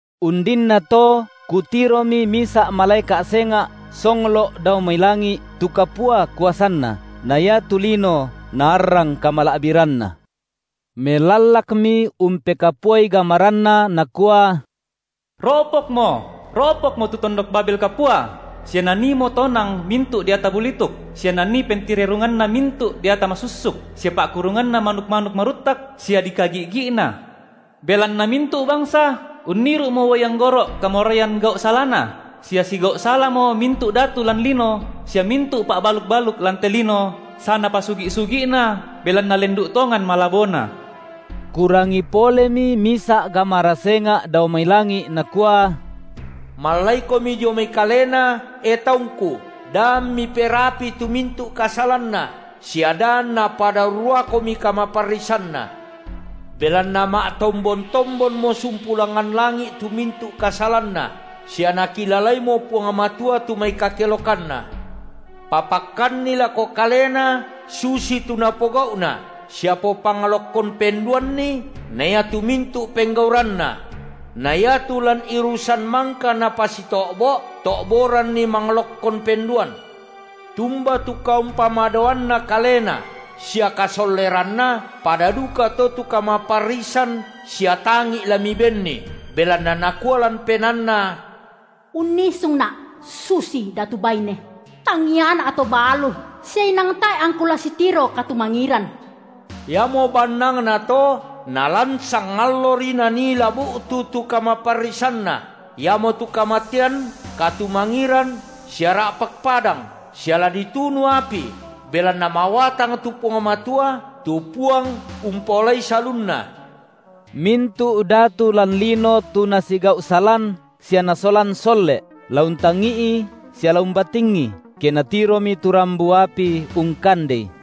Undinnato kutiromi misa’ malaeka’ senga’ songlo’ dao mai langi’ tu kapua kuasanna, na iatu lino naarrang kamala’biranna. Melallakmi umpekapuai gamaranna nakua: Ro’pokmo, ro’pokmo tu tondok Babel kapua sia naniimo tonang mintu’ deata bulituk, sia nanii pentirerunganna mintu’ deata masussuk, sia pa’kurunganna manuk-manuk maruttak sia dikagi’gi’na. Belanna mintu’ bangsa unniru’mo uai anggoro’ kamoraian gau’ salana, sia sigau’ salamo mintu’ datu lan lino sia mintu’ pa’baluk-baluk lan te lino sanapasugi’-sugi’na belanna lendu’ tongan malabona. Kurangi polemi misa’ gamara senga’ dao mai langi’ nakua: Mallaikomi dio mai kalena, e taungKu, da ammi perapii tu mintu’ kasalanna, sia da anna pada urruakomi kamaparrisanna; belanna ma’tombon-tombonmo sumpu langngan langi’ tu mintu’ kasalanna, sia Nakilalaimo Puang Matua tu mai kakelokanna. Papakkanni lako kalena susitu napogau’na sia popanglokkon penduanni na iatu mintu’ penggauranna; na iatu lan irusan mangka napasito’bo’, to’boranni manglokkon penduan. Tumba tu kaumpamadoanna kalena sia kasolleranna, pada dukato tu kamaparrisan sia tangi’ la mibenni, belanna nakua lan penaanna: Unnisungna’ susi datu baine; tangiana’ to balu, sia inang tae’ angku la sitiro katumangiran. Iamo bannangna to nalan sangallori nanii la bu’tu tu kamaparrisanna, iamotu kamatean, katumangiran sia ra’pak padang, sia la ditunu api, belanna mawatang tu Puang Matua, tu Puang umpaolai salunna. Mintu’ datu lan lino tu nasigau’ salan sia nasolan solle’, la untangi’i sia la umbatingi, ke natiromi tu rambu api ungkandei,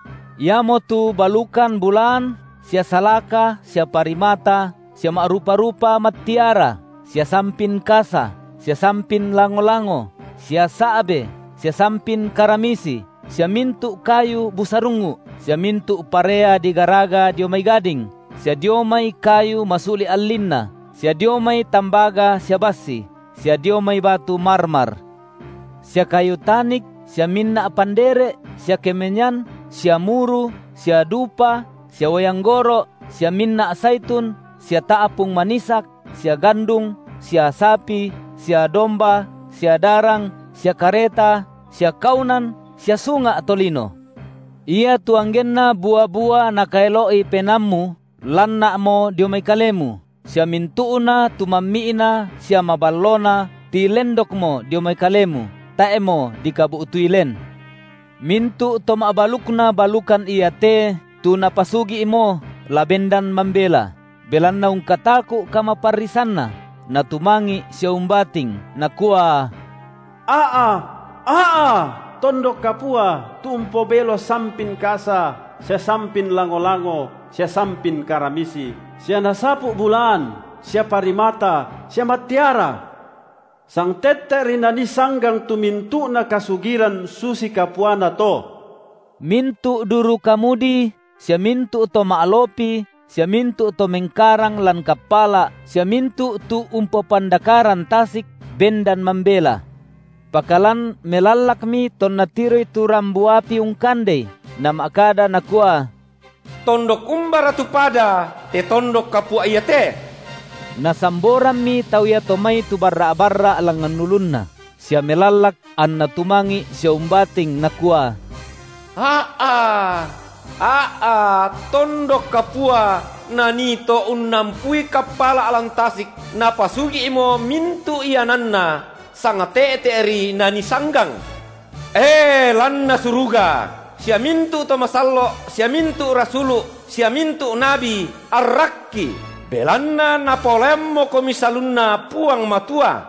iamotu balukan bulaan sia salaka sia parimata, sia ma’rupa-rupa mattiara, sia sampin kasa, sia sampin lango-lango, sia sa’be, sia sampin karamisi, sia mintu’ kayu busarungngu’, sia mintu’ parea digaraga dio mai gading, sia dio mai kayu masuli’ allinna, sia dio mai tambaga sia bassi, sia dio mai batu marmar, sia kayu tanik, sia minna’ pandere’, sia kemenian, sia muru, sia dupa, sia uai anggoro’, sia minna’ saitun, sia ta’pung manisak, sia gandung, sia sapi, sia domba, sia darang, sia kareta, sia kaunan sia sunga’ tolino. Iatu anggenna bua-bua nakaelo’i penaammu lanna’mo dio mai kalemu, sia mintu’na tu mammi’na sia maballona tilendokmo dio mai kalemu tae’mo dikabu’tui len. Mintu’ to ma’balukna balukan iate, tu napasugi’mo, la bendan mambela, belanna ungkataku’ kamaparrisanna, natumangi’ sia umbating, nakua: A’a, a’a tondok kapua, tu umpobelo sampin kasa, sia sampin lango-lango sia sampin karamisi, sia nasapu’ bulaan sia parimata sia mattiara! Sangte’te’ri nanii sanggang tu mintu’na kasugiran susi kapuana to. Mintu’ durukamudi, sia mintu’ to ma’lopi, sia mintu’ to mengkarang lan kappala’ sia mintu’ tu umpopandakaran tasik, bendan mambela. Pakalan melallakmi tonna tiroi tu rambu api ungkandei, nama’kada nakua: Tondok umbara tu pada te tondok kapua iate? Nasamborammi tau iato mai tu barra’-barra’ langngan ulunna sia melallak anna tumangi’ sia umbating nakua: A’a, a’a tondok kapua, nanii to unnampui kappala’ lan tasik, napasugi’mo mintu’ iananna; sangte’te’ri nanii sanggang! E, lanna suruga, sia mintu’ to masallo’ sia mintu’ rasulu’, sia mintu’ nabi arrakki, belanna Napaolaiammokomi salunna Puang Matua.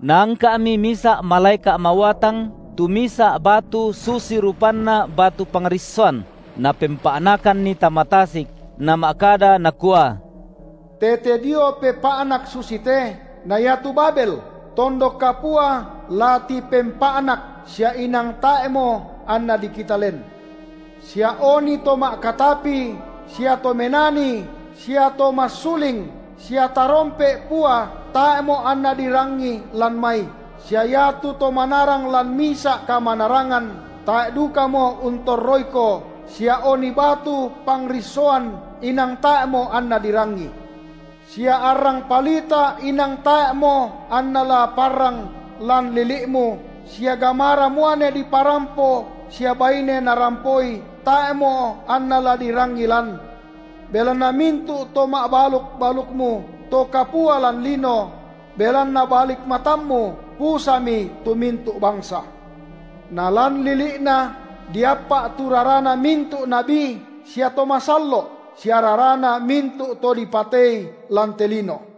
Naangka’mi misa’ malaeka’ mawatang tu misa’ batu susi rupanna batu pangrissoan, napempa’nakanni tama tasik nama’kada nakua: Tete dio pepa’nak susite, na iatu Babel, tondok kapua la tipempa’nak, sia inang tae’mo anna dikita len. Sia oni to ma’katapi sia to menani sia to massuling sia tarompe’ pua tae’mo anna dirangi lan mai, sia iatu to manarang lan misa’ kamanarangan, tae’ dukamo untorroiko, sia oni batu pangrissoan inang tae’mo anna dirangi. Sia arrang palita inang tae’mo anna la parrang lan lili’mu, sia gamara muane diparampo sia baine narampoi tae’mo anna la dirangi lan. Belanna mintu’ to ma’baluk-balukmu to kapua lan lino; belanna balik matammu, pusami tu mintu’ bangsa. Nalan lili’na diappa’ tu rarana mintu’ nabi sia to masallo’ sia rarana mintu’ to dipatei lan te lino.